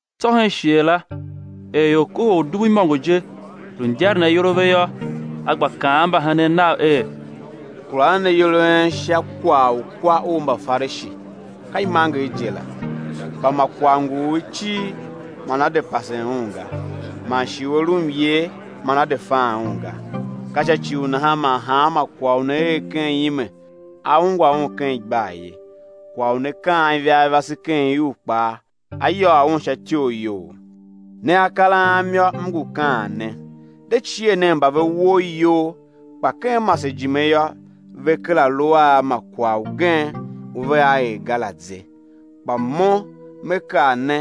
Tsô hen shighe la er ior kohol udubu imôngo je, lu ndyaren ayol a ve yô, A gba kaan a mbahenen Nav er: Kura nen ayol a en sha kwagh u kwa u Mbafarishi, ka imanger je la. Kpa ma kwagh ngu u i cir man á de pasen un ga; man shi u a lu myer, man á de fan un ga. Ka sha ci u nahan man hanma kwagh u ne er ken ime, á ungwa un ken igbar ye; kwagh u ne kaan ivarivase ken iuv kpaa á yôô un sha ityoriyoughough. Ne akar Am yô, M ngu kaan ne: De cie nen mba ve woo iyol kpa ken masejime yô, ve kera lu a ma kwagh ugen u vea er ga la ze. Kpa Mo Me kaa ne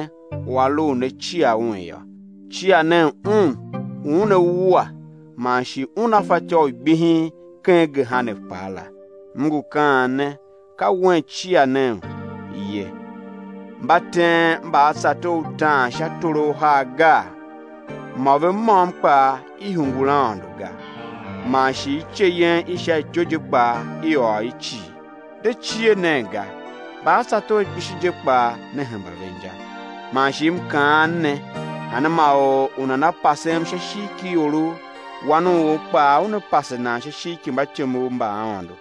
u a lu u ne cia Un yô; cia nen Un u Una wua man shi Una fatyô u gbihin ken gehena kpaa la; M ngu kaan ne, ka Wen cia nen ye. Mba teen mbaatsator utaan sha toro uhar gaa? Mô ve môm kpaa i hungul Aôndo ga. Man shi ice yen i sha ityou je kpaa i ôr i cii. De cie nen ga; mbaatsator kpishi je kpaa ne hemba ve inja. Man shi M kaan ne: Hanma or u nana pasem sha ishigh ki iorough, Wan u or kpaa Una pase nan sha ishigh ki mbatyomov mba Aôndo.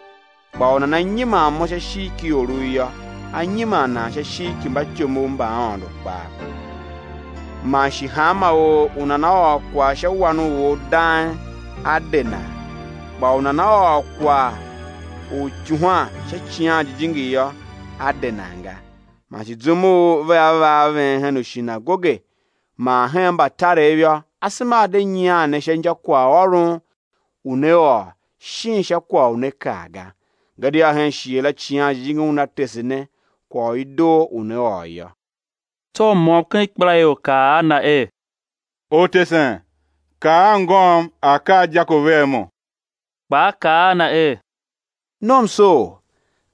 Kpa u nana nyiman Mo sha ishigh ki iorough yô, á nyiman nan sha ishigh ki mbatyomov mba Aôndo kpaa. Man shi hanma or u nana ôr kwagh sha Wan u or dang, á de nan, kpa u nana ôr kwagh u ityuhwan sha Icighan Jijingi yô, á de nan ga. Man shi zum u vea va a ven hen ushinagoge man hen mbatarev yô, asema a̱ de nyian ne sha inja kwaghôron u né ôr shin sha kwagh u né kaa ga; gadia hen shighe la Icighan Jijingi Una tese ne kwagh u i doo u né ôr yô. Tsô u môm ken ikpelaior kaa a Na er: Ortesen, kaa anngôm a̱ kar dyako vea mo. Kpa A kaa a na er: Nomsoor!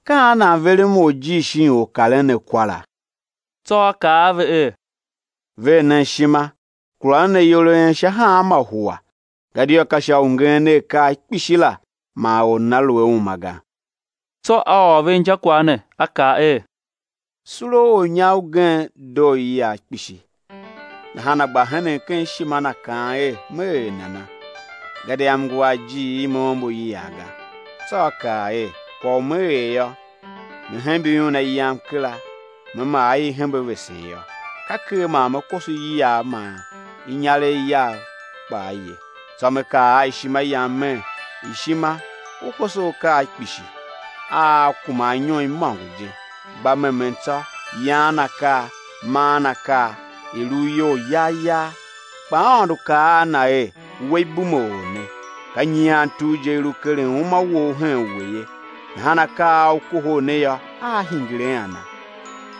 Ka an nan verem orjir shin or u karen ne kwara? Tsô A kaa a ve er: Ver nen ishima, kura nen ayol a en sha hanma hua; gadia ka sha u ngeen a akaa kpishi la man or nana lu a uma ga. Tsô A ôr ve injakwagh ne, A kaa er: Sule u ornyar ugen doo iyiagh kpishi. Nahan a gba henen ken ishima na, kaan er: Me er nana? Gadia m ngu a ijiir i me ombo iyiav ga. Tsô a kaa er: Kwagh u me er yô, me hembe iuna yam kera me maa i i hembe vesen yô, ka ker man me koso iyiagh man inyarev yav kpaa ye. Tsô me kaa a ishima yam mer: Ishima, u koso akaa kpishi, a aa kuma anyom imôngo je; gba memen tsô, yaan akaa, maan akaa, i̱ lu u iyol yagh yagh. Kpa Aôndo kaa a na er: We ibumeor ne! Ka nyian tugh je i lu keren uma wou hen we ye; nahan akaa a u kohol ne yô, aa hingir a ana?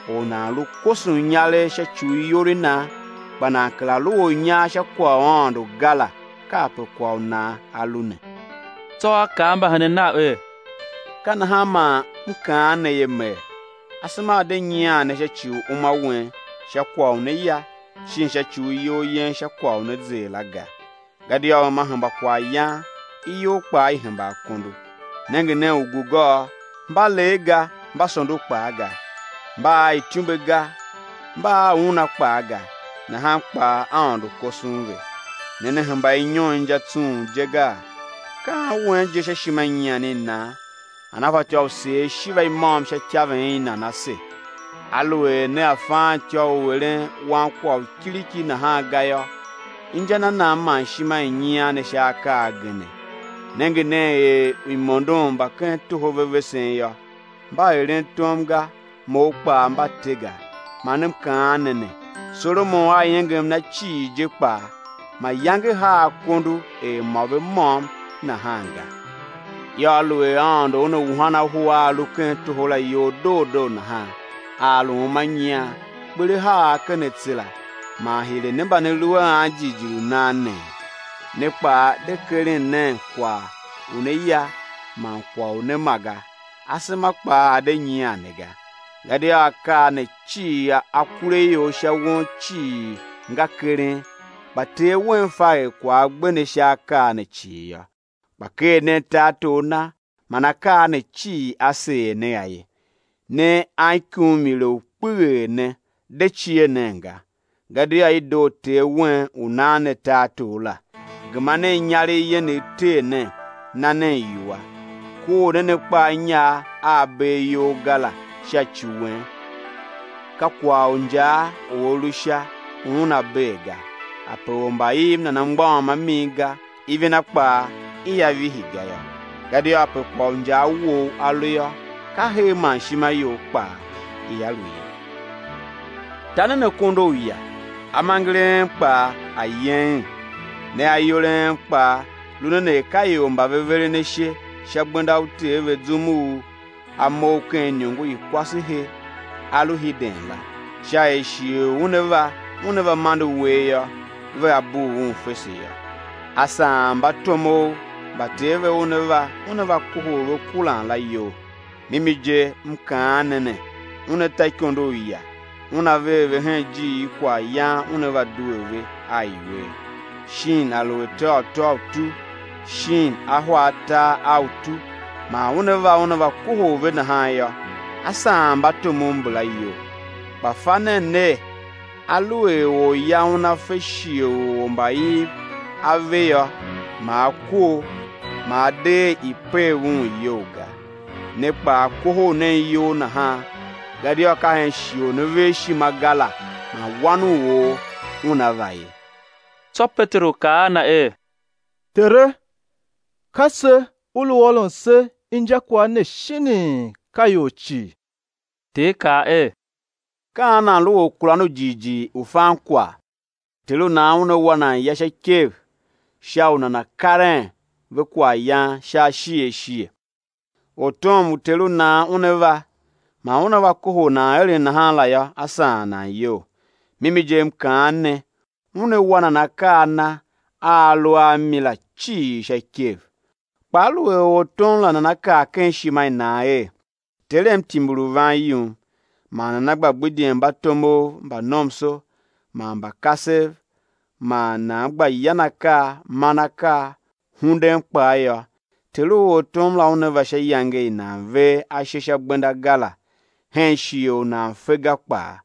Or u nan lu koson inyaregh sha ci u iyol i nan, kpa nan kera lu ornyar sha kwagh u Aôndo ga la, kape kwagh u nan a lu ne. Tsô A kaa mbahenen Nav er: Ka nahan man M kaan ne ye, mer, asema a̱ de nyian ne sha ci u uma wen sha kwagh u né zer la ga. Gadia uma hemba kwaghyan, iyol kpaa i hemba akondo. Nenge nen ugugôô, mba lee ga, mba sondo kpaa ga, mba a ityumbe ga, mba a una kpaa ga, nahan kpaa Aôndo koson ve; ne ne hemba inyon inja tsung je gaa? Ka an wen je sha ishima i nyian i nan, nana fatyô u seer ishiva i môm sha ityaven i nan ase? Aluer nea faan ityô u eren ankwagh u kiriki nahan ga yô, inja na nan man ishima i nyian ne sha akaa agene? Nenge nen er uimondon mba ken toho ve vesen yô; mba eren tom ga, mou kpaa mba te ga; man M kaan ne ne, Solomon a iengem na cii je kpaa mayange haa akondo er mo ve môm nahan ga. Yô, aluer Aôndo Una wuhan ahu a a lu ken toho la iyol doo doo nahan, a a lu uma nyian, kper á haa a ken atse la, man hire ne mba ne lu a anjighjigh u nan nee? Ne kpaa de keren nen kwagh u né ya man kwagh u né ma ga; asema kpaa a̱ de nyian ne ga; gadia akaa ne cii akuraior sha won cii nga keren; kpa Ter Wen fa er kwagh a gbe ne sha akaa ne cii yô. Kpa ker nen tartor Na man akaa ne cii á seer ne a ye. Ne anikumuile u kpeghee ne, de cie nen ga! Gadia i doo Ter wen u nan ne tartor la. Gema nen inyaregh yenegh tee nen, na nen iwua. Kor nen akpa a inyar a a bee iyol ga la sha ci wen, ka kwagh u injaa u a lu Sha u una bee ga, ape ormbaiv nana mgbôghom a min ga, ivina kpaa ia vihi ga yô; gadia ape kwagh u injaa wou a lu yô, ka her man ishima you kpaa ia lu ye. Ta nen akondo uya, amenger a en kpaa a̱ yeghen. Ne ayol a en kpaa, lu nen er ka ior mba veren ashe sha gbenda u ter ve zum u a mough ken iniongo i kwasehe a lu hiden la, sha er shighe u una va una va mande uwegh yô, vea bugh un fese yô. A saan mbatomov mba ter ve una va, una va kohol ve kuran la, iyol. Mimi je, M kaan ne ne, una ta ikondo uya, una ver ve hen ijiir i kwaghyan una va due ve a iwer. Shin a lu ateghatô u utu shin ahwa atar a utu man una va una va kohol ve nahan yô, á saan mbatomov mbala iyol. Kpa fa nen ner, aluer orya una fe shighe u ormbaiv a ve yô, ma a kor, ma a de er i̱ pev un iyou ga. Ne kpaa, kohol nen iyol nahan; gadia ka hen shighe u ne ver ishima ga la, man Wan u or Una va ye. Tsô Peteru kaa a Na er: Tere, ka se U lu ôron se injakwagh ne shinii ka ior cii? Ter kaa er: Ka an nan lu orkuran ya u jighjigh, u fan kwagh, u ter u nan una wa nan ya sha ikev sha u nana̱ karen ve kwaghyan sha ashighe ashighe? Ortom u ter u nan una va, man una va kohol nan eren nahan la yô, á saan nan iyol. Mimi je, M kaan ne, una wa nan akaa a na a a lu a mi la cii sha ikev. Kpa aluer ortom la nana kaa ken ishima i nan er: Terem timbir u van yum, man nana gba gbidyen mbatomov mba nomso man mba kasev man nana gba yan akaa, man akaa, hunden kpaa yô, ter u ortom la una va sha iyange i nan ver ashe sha gbenda ga la, hen shighe u nan fe ga kpaa,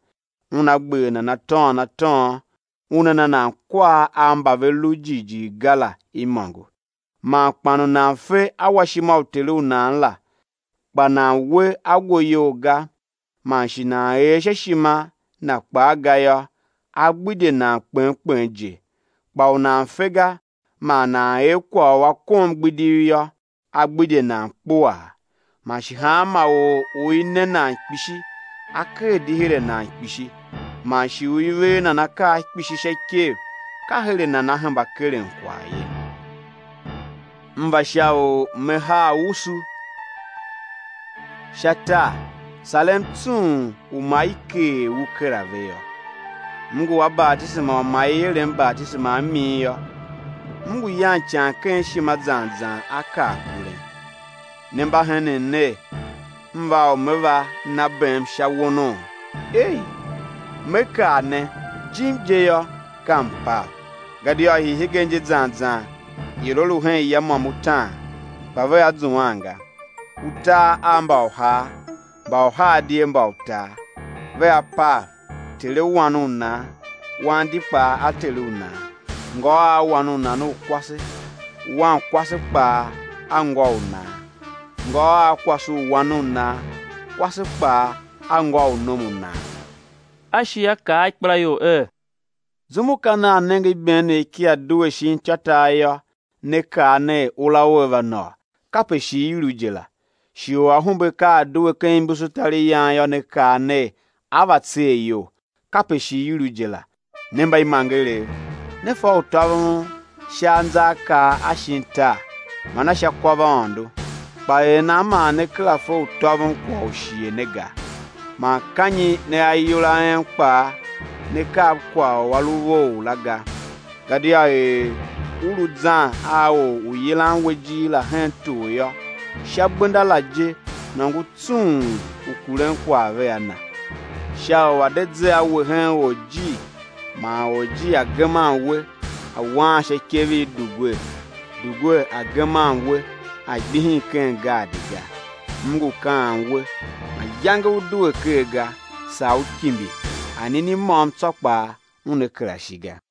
una gber nan atôôn atôôn, una na nan kwar a mba ve lu jighjigh ga la imôngo. Man kpan u nan fe awashima u ter u nan la, kpa nan we ago iyol ga, man shi nan er sha ishima na kpaa ga yô, á gbidye nan kpen kpen je. Kpa u nan fe ga, man nan er kwagh u a kom igbidiv yô, á gbidye nan kpuaa. Man shi hanma or u i ne nan kpishi, á ker di her a nan kpishi, man shi u i ver nan akaa kpishi sha ikev, ka her a nan á hemba keren kwagh ye. M va sha u Me haa usu sha tar; sarem tsung u ma i keer u kera ve yô. M ngu a batisema u ma i erem batisema a min yô; M ngu yan ican ken ishima zan zan á kar kuren. Ne mba henen ner, M va u Me va na bem sha wono? Ei! Me kaa ne, jim je yô, ka mpav. Gadia hii hegen je zan zan, ior á lu hen ya môm utaan, kpa vea zuan ga; utar a mba uhar, mba uhar di a mba utar. Vea pav, ter a wan u nan, wan di kpaa a ter u nan; ngô a wan u nan u kwase, wankwase kpaa a ngô u nan; ngô a kwase u wan u nan, kwase kpaa a ngô u nom u nan. A shi A kaa a ikpelaior er: Zum u ka nea nenge ibeenegh kia due shin ityôtar yô, ne kaa ner: Ura ua va nôô; kape shi i lu je la. Shighe u ahumbe ka a due ken imbusutariyan yô, ne kaa ner: á va tsee iyol; kape shi i lu je la. Ne mbaimangerev, ne fa u tôvon sha anzaakaa a shin tar man a sha kwavaôndo, kpa er nan man ne kera fe u tôvon kwagh u shighe ne ga? Man ka nyi ne ayol a en kpaa ne kar kwagh u a lu vough la ga? Gadia er u lu zan a or u yilan we ijir la hen tor yô, sha gbenda la je nôngo tsung u kuren kwagh vea na; sha u a̱ de ze a we hen orjir, man orjir a̱ geman we, a̱ waan sha ikev i dugwer, dugwer a̱ geman we a̱ gbihin ken gaadi ga. M ngu kaan we, mayange ú due ker ga, saa ú kimbi, anini môm tsô kpaa una kera shi ga.